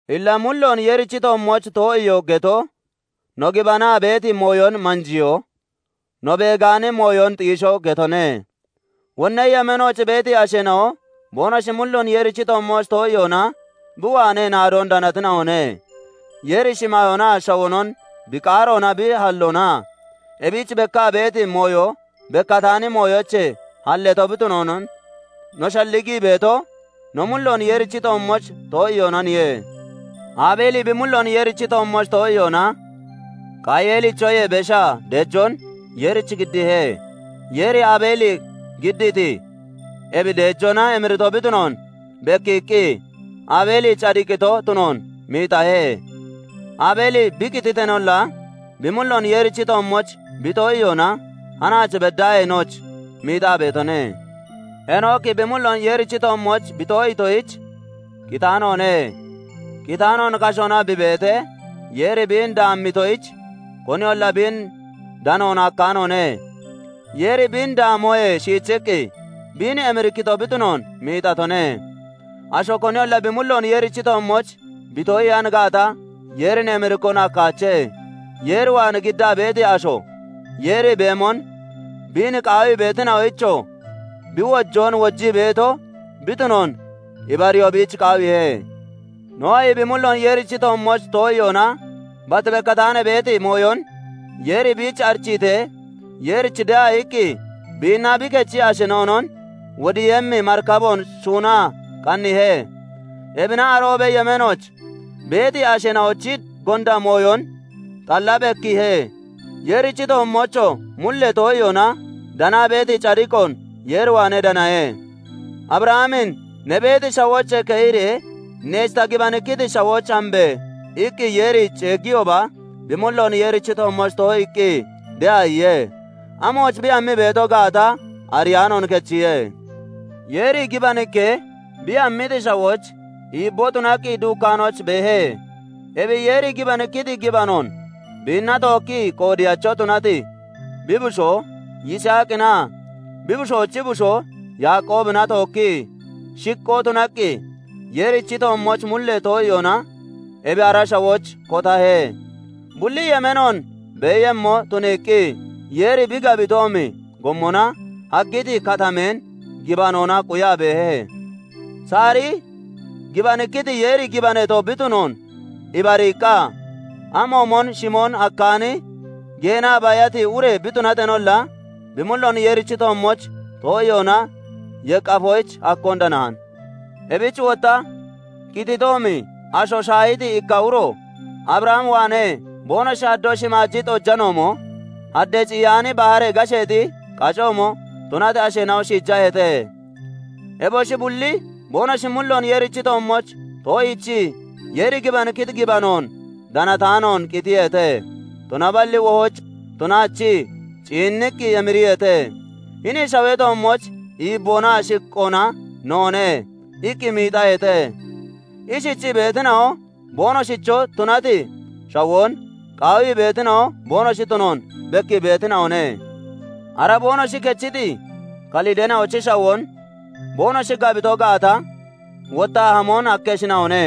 Illa mulloon Yeerichi toommooch too'iyoo geto no gibanaa beeti mooyon manjiyoo, no beegaani mooyonoo xiishoo getone. Wonnee yemeenooch beeti asheena'o boonoshi mulloon Yeerichi toommooch too'iyoona bi waanee naadoon danatina'one. Yeeri shimaayoonaa shawoonon bi qaaroona bi halloonaa ebich bekkaa beeti mooyo bekkataani mooyoochee halleeto bi tunoonon no shalligii beeto, no mulloon Yeerichi toommooch too'iyoonaniye. Abeeli bi mulloon Yeerichi toommooch too'iyoona Qaayeelichoyee besha deejoon Yeerich giddiihe; Yeeri Abeeli giddiiti ebi deejoona emirito bi tunoon bekkiiqqi, Abeeli cadiqito tunoon miixahe; Abeeli bi qititeenolla, bi mulloon Yeerichi toommooch bi too'iyoona hanaach beddaahee nooch miixaa beetone. Heenooki bi mulloon Yeerichi toommooch bi too'iitoyich qitaanoone; qitaanoon kashoona bi beetee, Yeeri biin daammitoyich, koniyolla biin danoon hakkaanoone; Yeeri biin daamoyee shiichiqqi, biin emirikkito bi tunoon miixatone. Asho koniyolla bi mulloon Yeerichi toommooch bi too'iyaan gaata, Yeerin emirikkoon hakkaache; Yeer waan giddaa beeti asho Yeeri beemon, biin qaawii beetina'oyichoo bi wojoon wojii beeto bi tunoon ibariyoo biich qaawiihe. Noohi bi mulloon Yeerichi toommooch too'iyoona bat bekkataan beeti mooyon Yeeri biich arichiitee, Yeerich de'a iqqi biinnaa bi kechi asheena'onon wodiiyemmi marikaboon shuunaa qanniihe. Ebina aroobee yemeenooch beeti asheena'ochi gonda mooyon xalla bekkiihe; Yeerichi toommoochoo mullee too'iyoona danaa beeti cadiqoon Yeer waanee danahe. Abrahamin "Ne beeti shawoochee keyiree neech ta gibanikkiti shawooch hambe!" iqqi Yeeri ceeggiyooba, bi mulloon Yeerichi toommooch too'iiqqi de'a iye; amooch bi hammii beeto gaata ariyaanoon kechiye. Yeeri gibanikkee bi hammiti shawooch iibboo tunaqqi duukkaanooch beehe; ebi Yeeri gibanikkiti gibanoon biinna tookkii qoodeyacho tunati bi bushoo Yisaaqinaa bi bushoochi bushoo Yaaqoobina tookkii shiqqoo tunaqqi, Yeerichi toommooch mullee too'iyoona ebi ara shawooch kotahe. Bulli yemeenoon beeyemmo tuniiqqi, Yeeri bi gabitoomi gommona haggiti katameen gibanoona quyaa beehe. Saari gibanikkiti Yeeri gibaneeto bi tunoon ibariiqqa, amoomon shimon hakkaani geenaa baayati ure bi tunateenolla, bi mulloon Yeerichi toommooch too'iyoona yeqqafoyich hakkoon danahan. Ebich wotta qititoomi asho shaahiti ikka uro Abraham waanee boonoshi haddoo shimaaji xojanoomo, haddee ciiyaani baharee gasheexi qacoomo tunati asheena'o shiijaheete. Eboshi bulli boonoshi mulloon Yeerichi toommooch too'iichii, Yeeri gibanikkiti gibanoon danataanoon qitiyeete; tunaballi wohooch tunaachii ciinniqqi emiriyeete; "Hini shawee toommooch iibboonaa shiqqoona noone" iqqi miixaheete. Ishichii beetina'o boonoshicho tunati shawoon qaawii beetina'o boonoshi tunoon bekkii beetina'one. Ara boonoshi kechiti Kaaldeena'ochi shawoon boonoshi gabito gaata, wottaa hamon hakkeshina'one.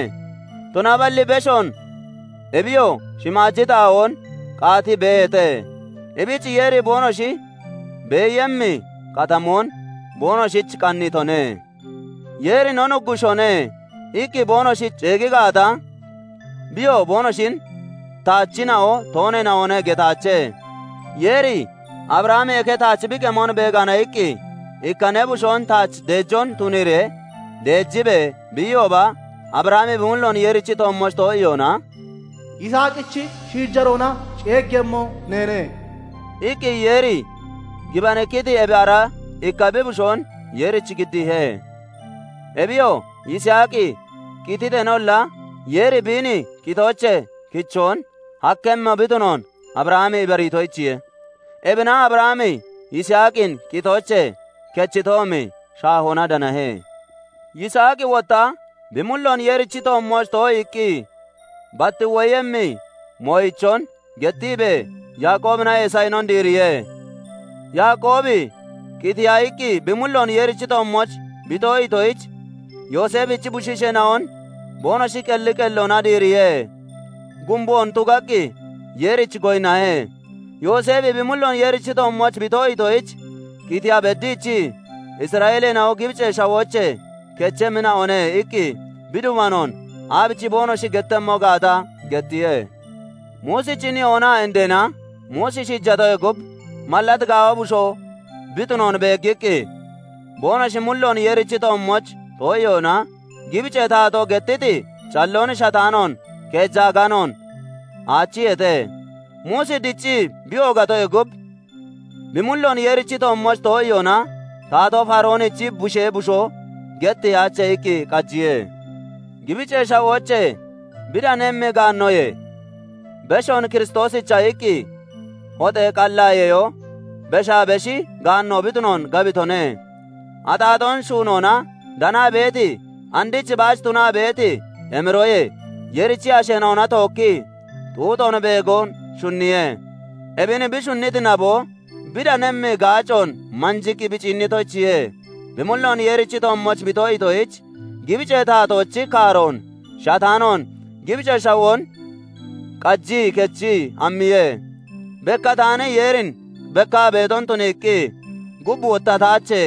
Tunaballi beshoon, ebiyoo shimaaji xaa'oon qaatii beeheete. Ebich Yeeri boonoshi beeyemmi katamoon boonoshich qanniitone; "Yeeri no Nuggushoone" iqqi boonoshi ceegi gaata, biyoo boonoshin "Taachina'o tooneena'one" getaache. Yeeri "Abrahami eke taach bi qemon beegana" iqqi, "Ikka ne bushoon taach deejoon tuniiree deejibe!" bi iyooba, Abrahami bi mulloon Yeerichi toommooch too'iyoona "Yisaaqichi shiijaroona ceeggeeyemmo neene" iqqi Yeeri gibanikkiti ebi ara ikka bi bushoon Yeerich giddiihe. Ebiyoo, Yisaaqi qititeenolla, Yeeri biin qitoochee kichoon hakkemmo bi tunoon Abrahami ibariitoyichiye; ebina Abrahami Yisaaqin qitoochee kechitoomi shaahoona danahe. Yisaaqi wotta bi mulloon Yeerichi toommooch too'iiqqi, bat woyemmi mooyichon gettiibee Yaaqoobinaa Eesayinon diiriye. Yaaqoobi qitiya iqqi bi mulloon Yeerichi toommooch bi too'iitoyich, Yooseefichi bushiisheena'on boonoshi qelli qelloona diiriye; gumboon tugaqqi Yeerich goyinnahe. Yooseefi bi mulloon Yeerichi toommooch bi too'iitoyich, qitiya beddiichii, "Isra'eeleena'o Gibicee Shawoochee kechemmina'one" iqqi bi dubanoon aabichi boonoshi gettemmo gaata gettiye. Muusichi nihoonaa indeena Muusi shiijatoyee gub mallat gaawa bushoo bi tunoon beeggiqqi, boonoshi mulloon Yeerichi toommooch too'iyoona Gibicee Taatoo gettiti calloon shataanoon keeja aganoon aachiyeete. Muusi diccii bi oogatoyee gub, bi mulloon Yeerichi toommooch too'iyoona "Taatoo Faaroonichi bushee bushoo getteyaache" iqqi qajiye. Gibicee Shawoochee bi danemmi gaannoyee beshoon Kiristoosicha iqqi hoxee qallaayeyoo beshaa beshi gaanno bi tunoon gabitone. Axaaxoon shuunoona danaa beeti, andich baach tunaa beeti emiroyee Yeerichi asheena'ona tookkii xuuxoon beegon shunniye. Ebin bi shunniti naboo, bi danemmi gaacoon manjiiqqi bi ciinnitoyichiye. Bi mulloon Yeerichi toommooch bi too'iitoyich, Gibicee Taatoochi kaaroon shataanoon Gibicee Shawoon qajii kechii hammiye; bekkataani Yeerin bekkaa beeton tuniiqqi, "Gub wottataache"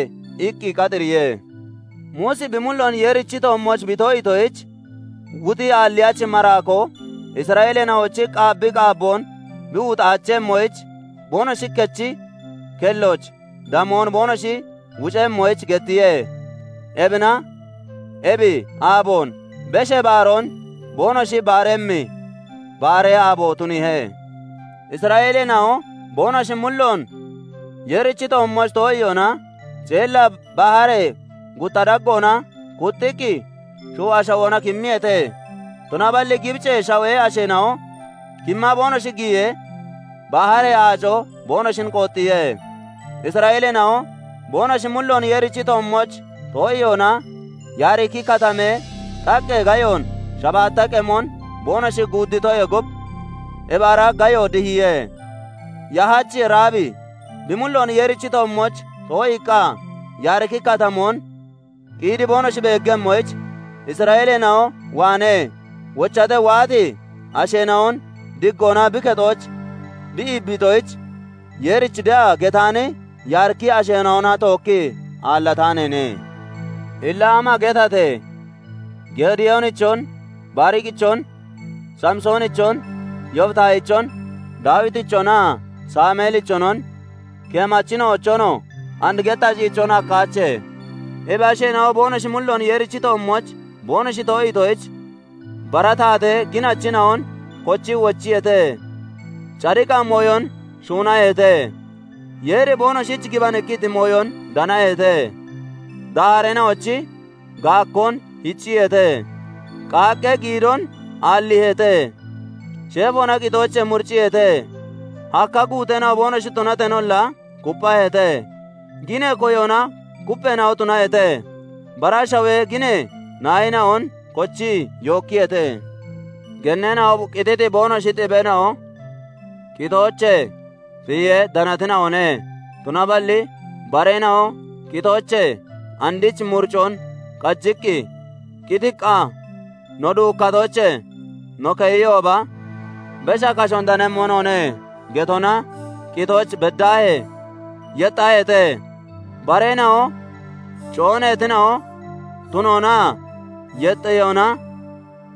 iqqi qaxiriye. Muusi bi mulloon Yeerichi toommooch bi too'iitoyich, wuxii aalliyachi maraakoo Isra'eeleena'ochi qaabbi qaabboon bi wuxaachemmoyich, boonoshi kechi kellooch damoon boonoshi wucemmoyich gettiye; ebina ebi aaboon Beshee Baaroon boonoshi baaremmi baaree aabo tuniihe. Isra'eeleena'o boonoshi mulloon Yeerichi toommooch too'iyoona Ceella Baharee gutta daggoona kuxxiqqi shuu'a shawoona kimmiyeete; tunaballi Gibicee Shawee asheena'o kimma boonoshi giyee, baharee aaco boonoshin qooxxiye. Isra'eeleena'o boonoshi mulloon Yeerichi toommooch too'iyoona Yaariki Katamee xaqqee gayoon shabaatta qemon boonoshi guudditoyee gub, ebi ara gayo dihiye. Yahachi Raabi bi mulloon Yeerichi toommooch too'iiqqa, Yaariki Katamoon qiidi (maaci) boonoshi beeggemmoyich, Isra'eeleena'o waanee wochatee waati asheena'on diggoona bi kexooch bi iibbiitoyich, Yeerich de'a getaani Yaariki asheena'ona tookkii aallataaneene. Illa ama getate? Geediyoonichon, Baariqichon, Samsoonichon, Yofitaahichon, Daawitichonaa Saameelichonon, keemachina'ochonoo, and gettaa ciichoon hakkaache. Ebi asheena'o boonoshi mulloon Yeerichi toommooch boonoshi too'iitoyich, bara taatee ginachina'on kochii wochiyeete; cadiqa mooyon shuunaheete; Yeeri boonoshich gibanikkiti mooyon danaheete; daahareena'ochi gaakkoon hicciyeete; qaaqqee giidoon aalliiheete; sheefoona qitoochee muricciyeete; hakka guuteena'o boonoshi tunateenolla, kupphaheete; ginee koyoona kuppheena'o tunaheete; bara shawee ginee naayina'on kochii yookkiyeete. Genneena'o qititi boonoshi xibeena'o qitoochee tiyee danatina'one; tunaballi bareena'o qitoochee andich muricon qajiqqi, "Qitiqqa no duukkatoochee no keyiyooba, besha kashoon danemmo noone" getona qitooch beddaahee yexxaheete. Bareena'o cooneetina'o tunoonaa yexxeyoona,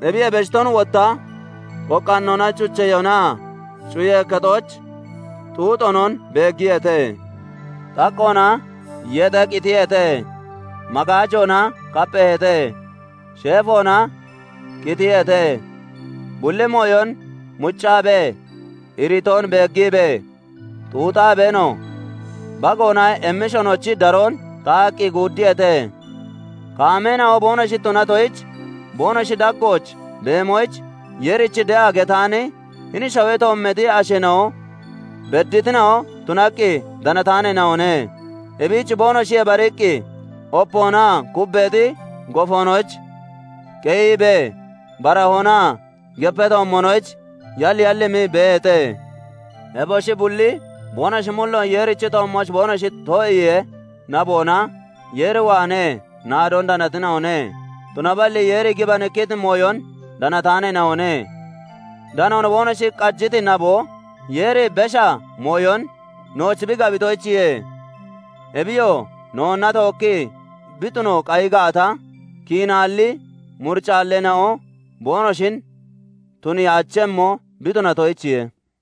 ebiyee beshiton wotta qoqqaannoona cucheyoonaa cuyee kexooch xuuxoonon beeggiyeete; xaqqoona yexee qitiyeete; magaajoona kappheeheete; sheefoona qitiyeete; bulli mooyon muccaabee, iritoon beeggiibee, xuuxaabeenoo bagoonaa emmishoonochi daroon tahaqqi guuddiyeete. Kaameena'o boonoshi tunatoyich, boonoshi daggooch beemoyich Yeerich de'a getaani hini shawee toommeexi asheena'o bedditina'o tunaqqi danataaneena'one; ebich boonoshiyee bariqqi opoonaa kubbeexi gofoonooch qeyiibee, barahoonaa gepee toommonooch yalyallimii beeheete. Eboshi bulli boonoshi mulloon Yeerichi toommooch boonoshi too'iyee naboona Yeer waanee naadoon danatina'one; tunaballi Yeeri gibanikkiti mooyon danataaneena'one. Danoon boonoshi qajiti naboo, Yeeri besha mooyon nooch bi gabitoyichiye; ebiyoo noonna tookkii bi tuno qayi gaata, kiinaalli muricaalleena'o boonoshin tuniyaachemmo bi tunatoyichiye.